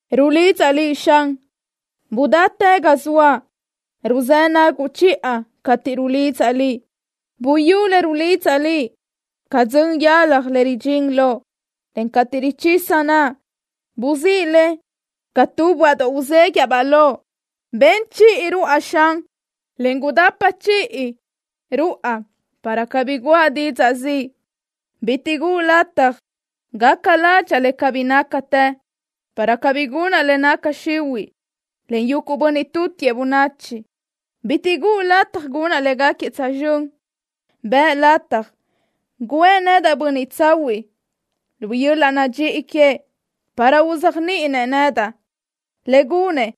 Rulidzaʼ Liʼ, Xan. Gudáchi ga zoaʼ. Ruzë́ naguʼ chiʼa cateʼ rulidzaʼ Liʼ. Buyú le rulidzaʼ Liʼ ca dzön yalaj le ridxín loʼ, en cateʼ richisa naʼa, buzíʼ le ca tu böaʼdoʼ uzéguiʼa-baʼ loʼ. Ben chiʼi ruáʼa, Xan, en gudapa chiʼi guídi ruáʼa para cabí guʼa didzaʼ ziʼ. Bitiʼ guʼu lataj gaca ládxaʼa le cabí nácatë, para cabí gunaʼ le naca xihuiʼ len yuguʼ bönniʼ tutiëʼ bönachi. Bitiʼ guʼu lataj gunaʼ léguequi tsözxö́n. Bëʼ lataj guʼë nedaʼ bönniʼ tsahuiʼ lu yöl-laʼ nadxíʼi queëʼ para uzéajniʼinëʼ nedaʼ. Le gunëʼ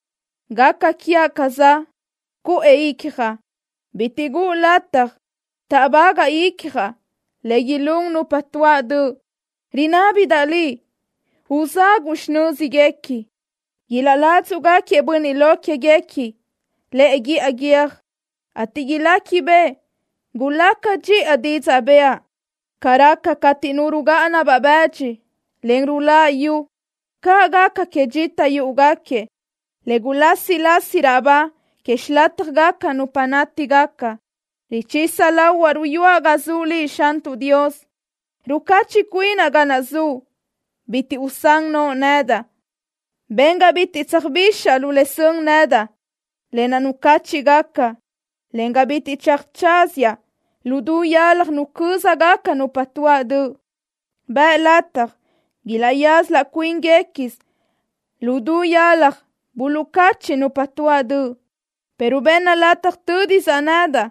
gaca quiaʼ ca le za cuʼë icjaʼ. Bitiʼ guʼu lataj táʼbagaʼ icjaʼ le ilún nupa tuáʼ döʼ. Rinábidaʼ Liʼ uzaguʼ xinö́zguequi. Ilaʼládzuʼgaquiëʼ bönniʼ lo quéguequi lëʼe guíʼa guiö́j, ateʼ iléquibeʼe gulaca dxiʼa didzaʼ bëʼa. Ca raca cateʼ nu rugáʼana-baʼ bëdxi, en ruláʼa yu, caʼ gaca que dxita yúʼugaquiëʼ, le gulásilasi raʼ ba que xilátjagaca nupa nátigaca. Richisa lahuaʼ ruyúaʼ ga zuʼ Liʼ, Xantuʼ Dios. Rucachiʼ cuinaʼ ga naʼ zuʼ. Bitiʼ usán noʼo nedaʼ. Ben ga bitiʼ tsöjbixaʼ lu le sön nedaʼ, lë naʼ nucáchiʼgaca, en ga bitiʼ tsöjtsazaʼ lu du yalaj nucö́zagaca nupa tuáʼ döʼ. Bëʼ lataj ilaʼyaza laʼ cuíngacasö lu du yalaj buluʼcachiʼ nupa tuáʼ döʼ, pero benna lataj tö́disaʼ nedaʼ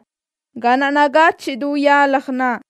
ga naʼ nagachiʼ du yalaj naʼ.